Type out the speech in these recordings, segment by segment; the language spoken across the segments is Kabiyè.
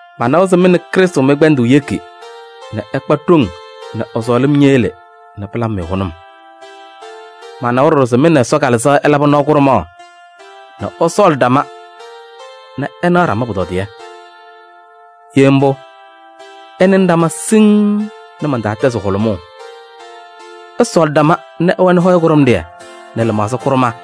Manawa se mɩ nɛ Krɩstʋ mɩ-kpɛndʋʋ yeki nɛ ɩkpa ɖoŋ nɛ ɛ-sɔɔlɩm ñeyele nɛ pɩlabɩ-mɩ hʋnʋm. Manawa ɖɔɖɔ se mɩ nɛ Ɛsɔ Kalɩzaɣ ɩlabɩ nɔɔ kʋɖʋmaɣ nɛ ɩsɔɔlɩ ɖama nɛ ɩnaɣ ɖama pʋtɔdɩyɛ. Ye mbʋ, ɩnɩnɩ ɖama siŋŋ nɛ man-taa tɛzɩ hʋlʋmʋʋ, ɩsɔɔlɩ ɖama nɛ ɩwɛnɩ hɔyɛ kʋɖʋmɖɩyɛ nɛ lɩmaɣza kʋɖʋmɛɛ.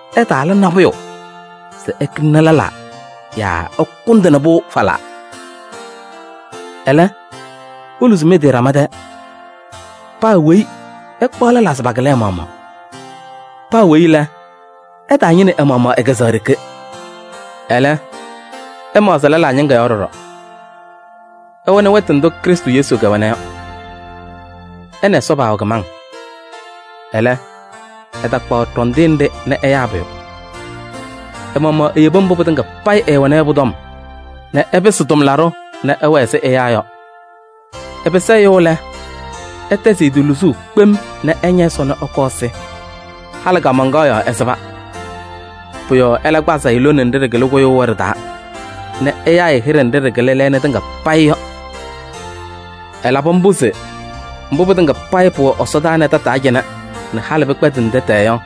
Ɩtaala nabʋyʋ se ɩkɩlɩnɩ lɛlaa yaa ɩkʋndɩnɩ-pʋ falaa. Ɛlɛ, iluzi mɩ-tɩ ɖama tɛɛ, paa weyi ɛkpaɣ lɛlaa se pakɩlɩ ɛ-maɣmaɣ. Paa weyi lɛ, ɛtaañɩnɩ ɛ-maɣmaɣ ɛ-kɛzɛɣa ɖeke. Ɛlɛ, ɛmaɣzɩ lɛlaa ñɩŋga yɔɔ ɖɔɖɔ. Ɩwɛnɩ wɛtʋ ndʋ Krɩstʋ Yesu kɛwɛna yɔ. Ɛ nɛ Ɛsɔ paawɛ kɩmaŋ. Ɛlɛ, ɛtakpaɣ ɖɔndɩyɛ nɖɩ nɛ ɛyaa pʋyʋ. Ɛ-maɣmaɣ eyebi mbʋ pɩtɩŋa payɩ ɛɛwɛna yɔ pʋ-tɔm nɛ ɛpɩsɩ tʋmlaɖʋ nɛ ɛwɛɛ ɛzɩ ɛyaa yɔ. Ɛpɩsɩ ɛyʋ lɛ, ɛtɛzɩ ɛ-tɩ luzuu kpem nɛ ɛña Ɛsɔ nɛ ɛkɔɔ ɛsɩ. Halɩ kaamaŋkaɣ yɔɔ ɛsɩba. Pʋ-yɔɔ ɛlɛ kpazɩ-ɩ lone nɖɩ ɖɩkɩlɩ kʋyʋʋ yɔ ɖɩ-taa nɛ ɛyaa-ɩ hɩɖɛ nɖɩ ɖɩkɩlɩ lɛɛna tɩŋa payɩ yɔ. Ɛlabɩ mbʋ se mbʋ pɩtɩŋa payɩ pʋwɛ ɛsɔdaa nɛ tataa cɩnɛ nɛ halɩ pɩkpɛndɩnɩ tɛtɛɛ yɔ,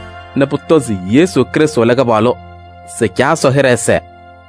pʋtɔ se Yesu Krɩstʋ lɛ Kɩpaɣlʋ se Caa Ɛsɔ hɩɖɛ ɛsɛɛ.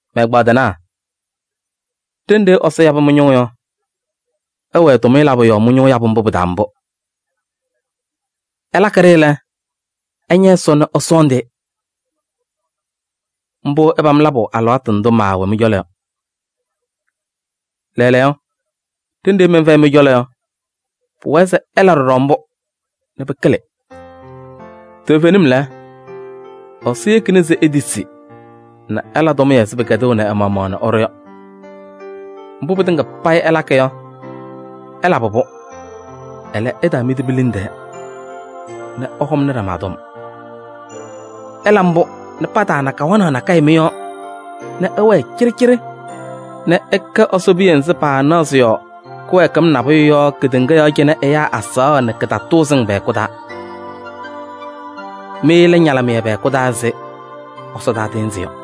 Mɛ-ɛgbaadɩnaa! Ɖenɖe Ɛsɔ yabɩ mɩ-ñʋʋ yɔ, ɩwɛɛ tʋmɩyɛ labʋ yɔɔ ñʋʋ yabʋ mbʋ pɩ-taa. Ɩlakɩ-ɖɩ lɛ, ɩña Ɛsɔ nɛ ɩsɔɔndɩ-ɩ. Mbʋ ɩpam labʋ alɩwaatʋ ndʋ maawɛ mɩ-cɔlɔ yɔ. Lɛɛlɛɛyɔ, ɖenɖe mɛnfɛyɩ mɩ-cɔlɔ yɔ, pʋwɛɛ se ɩla mbʋ ɖɔɖɔ nɛ pɩkɩlɩ. Toovenim lɛ, Ɛsɔ yekina se itisi nɛ ɩla tʋmɩyɛ ɛzɩ pɩkɛdɩnaʋ ɛ-maɣmaɣ nɛ ɛɖʋ yɔ. Mbʋ pɩtɩŋa payɩ ɩlakɩ yɔ, ɩlabɩ-pʋ, ɛlɛ, ɩtaamidi mi-liŋ tɛɛ nɛ ɩhɔŋnɩ ɖama tɔm. Ɩla mbʋ nɛ pataana kawanaɣ nakɛyɛ mɩ-yɔɔ nɛ ɩwɛɛ cɩɖɩcɩɖɩ nɛ ɩkɛ Ɛsɔ piya nzɩ paanaɣ sɩ-yɔɔ kɩwɛɛkɩm nabʋyʋ yɔ kedeŋa yɔɔ cɩnɛ ɛyaa azaɣa nɛ kɩtatʋʋzɩŋ pɛ-hɛkʋ taa. Mɩ lɛ ñalɩmɩyɛ pɛ-hɛkʋ taa ɛzɩ ɛsɔdaa tɩɩnzɩ yɔ.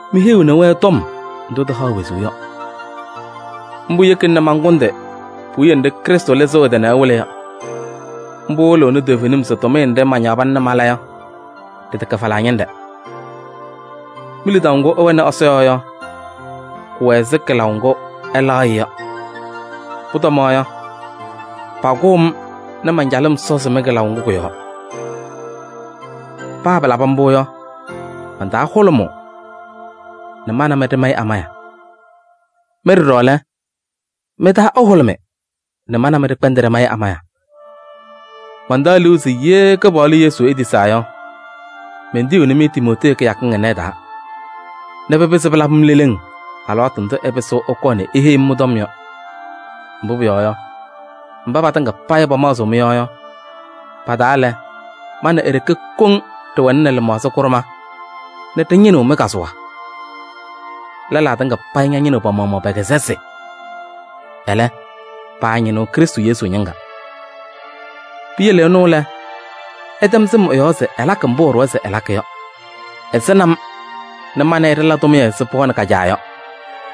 Miheyiɣni-wɛ tɔm ndʋ tɩhaɣ wezuu yɔ. Mbʋ yekina nɛ mankʋndɩ puwiye nɖɩ Krɩstʋ lɩzɩɣ ɛ-tɩ nɛ ɛwɩlɩ yɔ. Mbʋ wɩlɩɣnɩ toovenim se tʋmɩyɛ nɖɩ mañaɣ pana nɛ mala yɔ, ɖɩtɛkɛ falaa ñɩnɖɛ. Mi-lidaʋ ŋgʋ ɩwɛnɩ Ɛsɔ yɔɔ yɔ, kʋwɛ ɛzɩ kɩlaʋ ŋgʋ ɩlaɣ-ɩ yɔ. Pʋtɔma yɔ, pakʋʋ-m nɛ man-calɩm sɔzɩ mɩ-kɩlaʋ ŋgʋ kʋ-yɔɔ. Paa pɩlaba mbʋ yɔ, man-taa hʋlʋmʋʋ nɛ ma nɛ mɩ ɖɩmayɩ amaya. Mɩ ɖɔɖɔ lɛ, mɩ-taa ɛhʋlʋmɩ nɛ ma nɛ mɩ ɖɩkpɛndɩ ɖɩmayɩ amaya. Mantaɣ liu se ye Kɩpaɣlʋ Yesu etisaa yɔ, mentiyiɣni-mɩ Timootee kɩyakɩŋ ɩnɛ ɩ-taa nɛ pɩpɩzɩ pɩlabɩ-m leleŋ alɩwaatʋ ndʋ ɛpɩsɩɣ ɛkɔɔ nɛ eheyi-m mɩ-tɔm yɔ. Mbʋ pʋyɔɔ yɔ, mba patɩŋa payɩ pamaɣzɩɣ mɩ-yɔɔ yɔ, pa-taa lɛ, ma nɛ e-ɖeke koŋ ɖɩwɛnɩnɩ lɩmaɣza kʋɖʋmɛɛ nɛ ɖɩñɩnɩɣ mɩ-kazʋwa. Lɛlaa tɩŋa payɩ ñɩnɩɣ pa-maɣmaɣ pɛ-kɛzɛsɩ, ɛlɛ paañɩnɩɣ Krɩstʋ Yesu ñɩŋga. Piyele ɛnʋ lɛ, ɩtɛm sɩm ɛ-yɔɔ se ɛlakɩ mbʋ ɛɖʋwa se ɛlakɩ yɔ: ɛsɩnɩ-m nɛ ma nɛ ɩ ɖɩla tʋmɩyɛ ɛzɩ pɩɣa nɛ ka-caa yɔ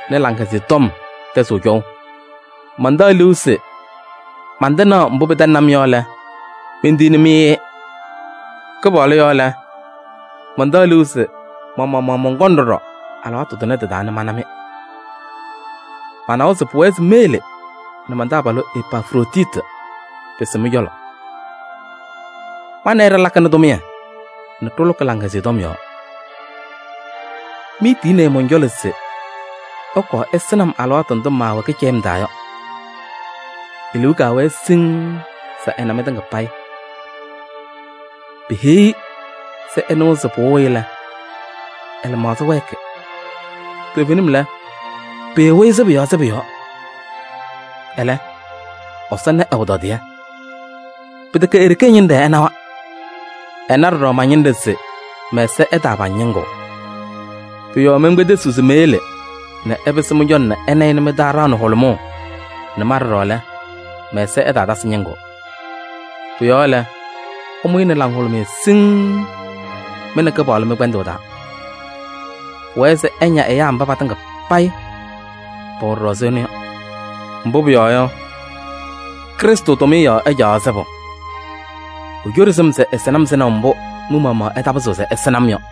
nɛ Laŋhɛzɩyɛ Tɔm tɛzɩɣ cɔʋ. Mantaɣ liu se mantɩnaɣ mbʋ pɩtɛŋnɩ-m yɔ lɛ, mentiyiɣni-mɩ-ɩ. Kɩpaɣlʋ yɔɔ lɛ, mantaɣ liu se ma-maɣmaɣ mɔnkɔŋ ɖɔɖɔ alɩwaatʋ tʋnɛ tɩ-taa nɛ mana-mɩ. Manawa se pʋwɛɛ se meyele nɛ man-taabalʋ Epafroditi pɩsɩ mɩ-cɔlɔ. Ma nɛ ɩ ɖɩlakɩnɩ tʋmɩyɛ nɛ ɖɩlʋkɩ Laŋhɛzɩyɛ Tɔm yɔɔ. Miitiyini-i mɔn-cɔlɔ se ɛkɔɔ ɛsɩnɩ-m alɩwaatʋ ndʋ maawɛ kɩcɛyɩm taa yɔ. E-liu kaawɛ siŋŋ se ɛna mɩtɩŋa payɩ. Peheyi-i se ɩnɩwa se pɩwɩɣ-ɩ lɛ, ɛ-lɩmaɣza wɛɛkɩ. Toovenim lɛ, pɩwɩ-ɩ sɩbʋ yɔɔ sɩbʋ yɔɔ. Ɛlɛ, Ɛsɔ na ɛ-pʋtɔdɩyɛ. Pɩtɛkɛ e-ɖeke ɛ-ñɩnɖɛ ɛnawa. Ɛna ɖɔɖɔ ma-ñɩnɖɛ se mɛ-ɛza ɛtaapaŋ ñɩŋʋʋ. Pʋ-yɔɔ menkpedesiɣ se meyele nɛ ɛpɩsɩ mɩ-cɔlɔ nɛ ɩna-ɩ nɛ mɩ-taa ɖaɣnɩ hʋlʋmʋʋ nɛ ma ɖɔɖɔ lɛ, mɛ-ɛza ɛtaatasɩ ñɩŋʋʋ. Pʋ-yɔɔ lɛ, ɩmʋ-ɩ nɛ laŋhʋlʋmɩyɛ siŋŋ mɩ nɛ Kɩpaɣlʋ mɩ-kpɛndʋʋ taa. Pʋwɛɛ se ɩña ɛyaa mba patɩŋa payɩ pɛwɛ ɖɔɖɔ ɛzɩ ɛnʋ yɔ. Mbʋ pʋyɔɔ yɔ, Krɩstʋ tʋmɩyɛ yɔɔ ɛcaɣaɣ sɩbʋ: ecoɖi sɩm se ɛsɩnɩ-m sɩnaʋ mbʋ mɩ-maɣmaɣ ɩtaapɩzɩɣ se ɩsɩnɩ-m yɔ.